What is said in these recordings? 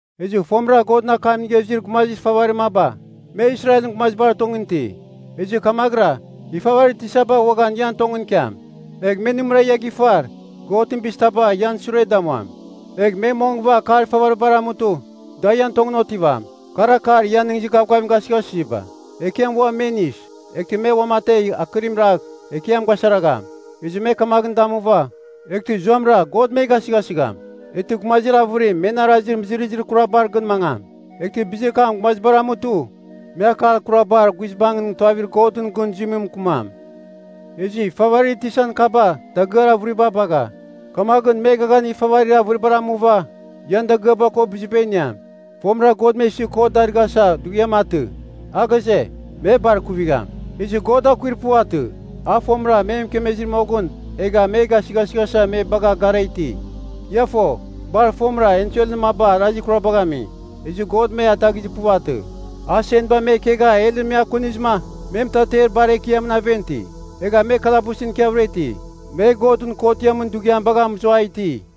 Ezɨ fomɨra Godɨn akam inigha izir gumazir ifavarir maba, me Israelɨn gumazibar tongɨn iti. Ezɨ kamaghɨra ifavarir tisaba uaghan ian tongɨn ikiam. Egh me nɨmɨra ia gifar, Godɨn bizir taba ian sure damuam. Egh me mongɨva akar ifavaribar amutɨ, da ian tongɨn otivam, kar akar ian nɨghnɨzir gavgavim gasɨghasɨziba. Ekiam ua me inis, eghtɨ me uamategh akɨrim ragh, Ekiam gasaragham. Ezɨ me kamaghɨn damuva, eghtɨ zuamɨra God me gasɨghasɨgham. Eghtɨ gumazir avɨrim men arazir mɨzɨrɨzir kurabar gɨn mangam. Eghtɨ bizir kam gumazibar amutɨ me akar kurabar guizbangɨn tuavir Godɨn gɨn zuimɨn mɨkɨmam. Ezɨ ifavarir tisan kaba dagɨar avɨriba bagha, kamaghɨn me eghaghanir ifavarir avɨribar amuva, ian dagɨaba ko biziba iniam. Fomɨra God me isɨ kot darɨghasa dughiam atɨ, a ghaze, me bar ikuvigham. Ezɨ God akuir puvatɨ. A fomɨra me mɨkemezir moghɨn egha me gasɨghasɨghasa me bagha gara iti. Ia fo, bar fomɨra enselɨn maba arazir kurabagh ami, ezɨ God me ataghizir puvatɨ. A senba me kegha helɨn me akunizɨma me mɨtater bar ekiamɨn aven ti. Egha me kalabusɨn ikiavɨra iti, me Godɨn kotiamɨn dughiam bagha mɨzua iti.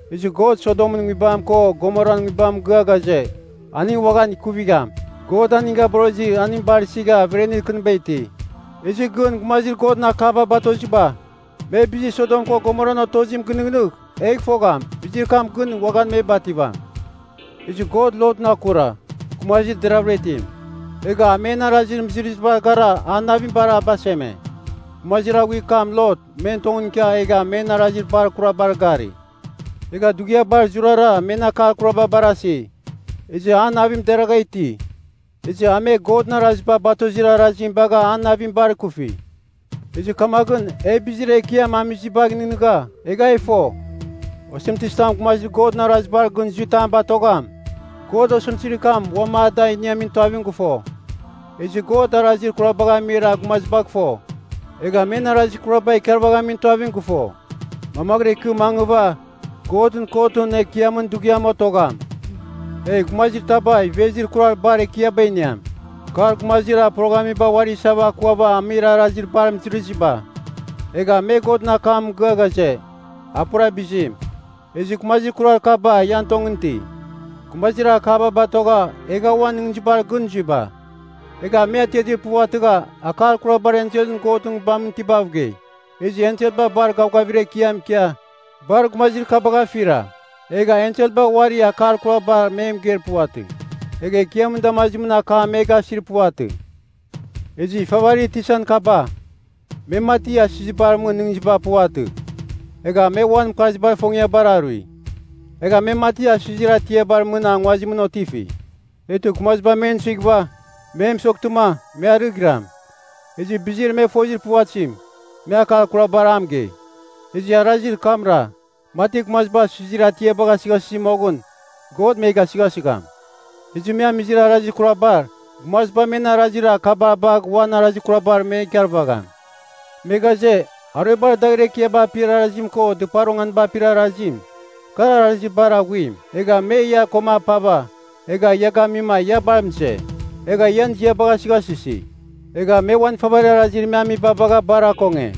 Ezɨ God Sodomɨn nguibam ko Gomoran nguibam mɨgɨa ghaze, aning uaghan ikuvigham. God aning gaborozɨ aning bar isigha, averenir kɨniba iti. Ezɨ gɨn gumazir Godɨn akaba batoziba, me bizir Sodom ko Gomoran otozim gɨnɨghnɨgh, egh fogham bizir kam gɨn uaghan me bativam. Ezɨ God Lotɨn akura, gumazir deravɨra itim. Egha a, men arazir mɨzɨrɨzibar gara an navim bar a baseme. Gumazir aghuir kam Lot men tongɨn ikia egha men arazir bar kurabar gari. Egha dughiabar zurara men akar kuraba barasi. Ezɨ an navim deragha iti. Ezɨ a me Godɨn araziba batozir arazim bagha an navim bar ikufi. Ezɨ kamaghɨn e bizir Ekiam amizibagh nɨghnɨgha, egha e fo, osɨmtɨzitam gumazir Godɨn arazibar gɨn zui tam batogham, God osɨmtɨzir kam uam ada a iniamin tuavim gɨfo. Ezɨ God arazir kurabagh amir gumazibagh fo, egha men arazir kuraba ikarvaghamin tuavim gɨfo, mamaghɨra ikɨ mangɨva Godɨn Kotɨn Ekiamɨn Dughiam otogham. Egh gumazir taba ivezir kurar bar ekiaba iniam. Kar gumazir poroghamiba uari isava akuava amir arazir bar mɨzɨrɨziba. Egha me Godɨn akam mɨgɨa ghaze, a pura bizim. Ezɨ gumazir kurar kaba ian tongɨn iti, gumazir akaba batogha egha uan nɨghnɨzibar gɨn zuiba. Egha me atiatir puvatɨgha akar kurabar enselɨn Godɨn Nguibamɨn itibav gei. Ezɨ enselba bar gavgavir ekiam ikia, bar gumazir kabagh afira. Egha enselba uari akar kurabar me mɨgeir puvatɨ, egha Ekiamɨn damazimɨn akam me gasir puvatɨ. Ezɨ ifavarir tisan kaba, me mati asizibar mɨn nɨghnɨziba puvatɨ, egha me uan mɨkarzibar ifongiabar arui. Egha me mati asɨzir atiabar mɨn nguazimɨn otifi, eghtɨ gumaziba men suighɨva me mɨsoghtɨma me arɨghiram. Ezɨ bizir me fozir puvatɨzim, me akar kurabar a mɨgei. Ezɨ arazir kamra mati gumaziba asɨzir atiaba gasɨghasɨzi moghɨn God me gasɨghasɨgham. Ezɨ me amizir arazir kurabar, gumaziba men arazir kaba bagh ua arazir kurabar me ikarvagham. Me ghaze, aruebar dagher ekiaba apir arazim ko dɨpar onganiba apir arazim, kar arazir bar aghuim. Egha me ia koma apava, egha ia gamima ia bar mɨze, egha ian ziabagh asɨghasɨsi. Egha me uan ifavarir arazir me amiba bagha bar akonge.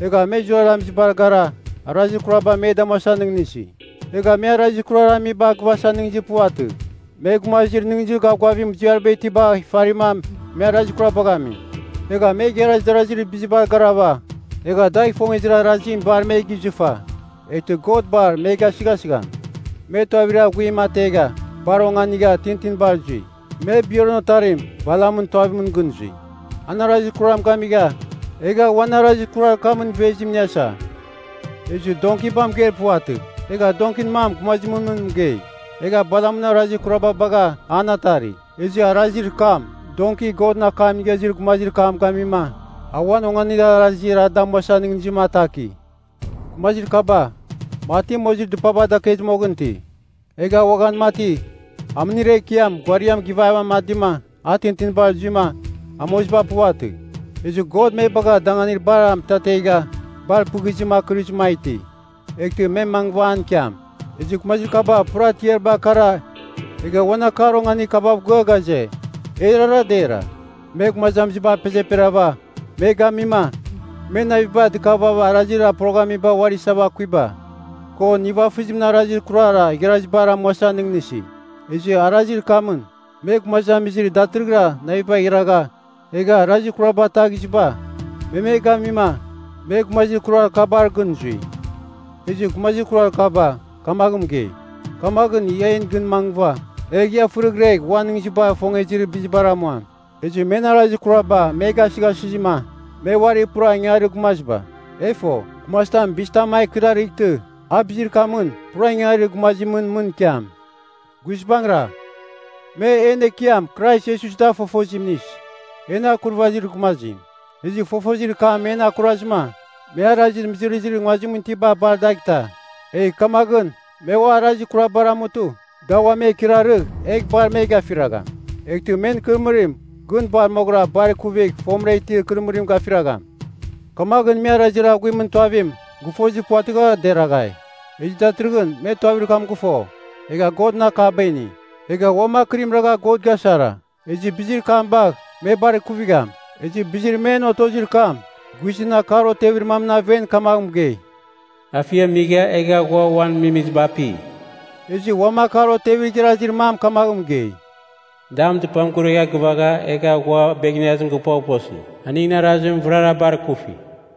Egha me zurara amizibar gara, arazir kurabar me damuasa nɨghnɨsi. Egha me arazir kurar amiba gɨvasa nɨghnɨzir puvatɨ. Me gumazir nɨghnɨzir gavgavir muziariba itibagh ifarima me arazir kurabagh ami. Egha me igharaz darazir bizibar garava, egha dagh ifongezir arazimɨn bar me gizɨfa. Eghtɨ God bar me gasɨghasigham! Me tuavir aghuim ategha, bar onganigha tintinibar zui. Me Beorɨn otarim Balamɨn tuavimɨn gɨn zui. An arazir kuram gamigha, egha uan arazir kurar kamɨn ivezim iniasa. Ezɨ donkiba mɨgeir puvatɨ. Egha donkin mam gumazimɨn mɨn mɨgei, egha Balamɨn arazir kuraba bagh an atari. Ezɨ arazir kam donki Godɨn akam inigha izir gumazir kam gamima, a uan onganir arazir a damuasa nɨghnɨzim ataki. Gumazir kaba, mati mozir dɨpaba dakezir moghɨn iti, egha uaghan mati amɨnir ekiam ghuariam gɨvava amadima a tintinibar zuima amoziba puvatɨ. Ezɨ God me bagha danganir bar mɨtategha bar pɨghizim akɨrizɨma a iti. Eghtɨ me mangɨva an ikiam. Ezɨ gumazir kaba pura tiariba akara egha uan akar onganir kabav gɨa ghaze, erara dera. Me gumazamiziba apezeperava me gamima, me naviba dɨkavava arazir poroghamiba uari isava akuiba, ko nivafɨzimɨn arazir kurar igharazibar amuasa nɨghnɨsi. Ezɨ arazir kamɨn, me gumazamizir datɨrɨghɨra navibagh iragha egha arazir kuraba ataghiziba, me me gamima me gumazir kurar kabar gɨn zui. Ezɨ gumazir kurar kaba kamaghɨn mɨgei, “Kamaghɨn ia en gɨn mangɨva, egh ia fɨrɨghregh uan nɨghnɨzibar ifongezir bizibar amuam.” Ezɨ men arazir kuraba me gasɨghasɨzima, me uari pura ingangarir gumaziba. E fo, gumazitam bizitam a ikɨrarightɨ, a bizir kamɨn pura ingangarir gumazimɨn mɨn ikiam. Guizbangɨra, me en Ekiam Krais Iesus da fofozim inis, en Akurvazir Gumazim. Ezɨ fofozir kam men akurazɨ me arazir mɨzɨrɨzir nguazimɨn itiba bar adagh ita. Egh kamaghɨn me ua arazir kurabar amutɨ, da ua me ikɨrarɨgh egh bar me gafiragham. Eghtɨ men ikɨrɨmɨrim gɨn bar moghɨra bar ikuvigh fomɨra itir ikɨrɨmɨrim gafiragham. Kamaghɨn me arazir aghuimɨn tuavim gɨfozir puvatɨgha, deraghai. Ezɨ datɨrɨghɨn me tuavir kam gɨfo, egha Godɨn akaba ini, egha uam akɨrim ragha God gasara. Ezɨ bizir kam bagh me bar ikuvigham. Ezɨ bizir men otozir kam, guizɨn akar otevir mamɨn aven kamagh mɨgei, “Afiam migha egha ghua ua uan mimiziba api.” Ezɨ uam akar otevir igharazir mam kamaghɨn mɨgei, “Dam dɨpam guregha gɨfa, egha ua ghua beghneazim gɨpoghposi.” Aningɨn arazim vɨrara bar kufi.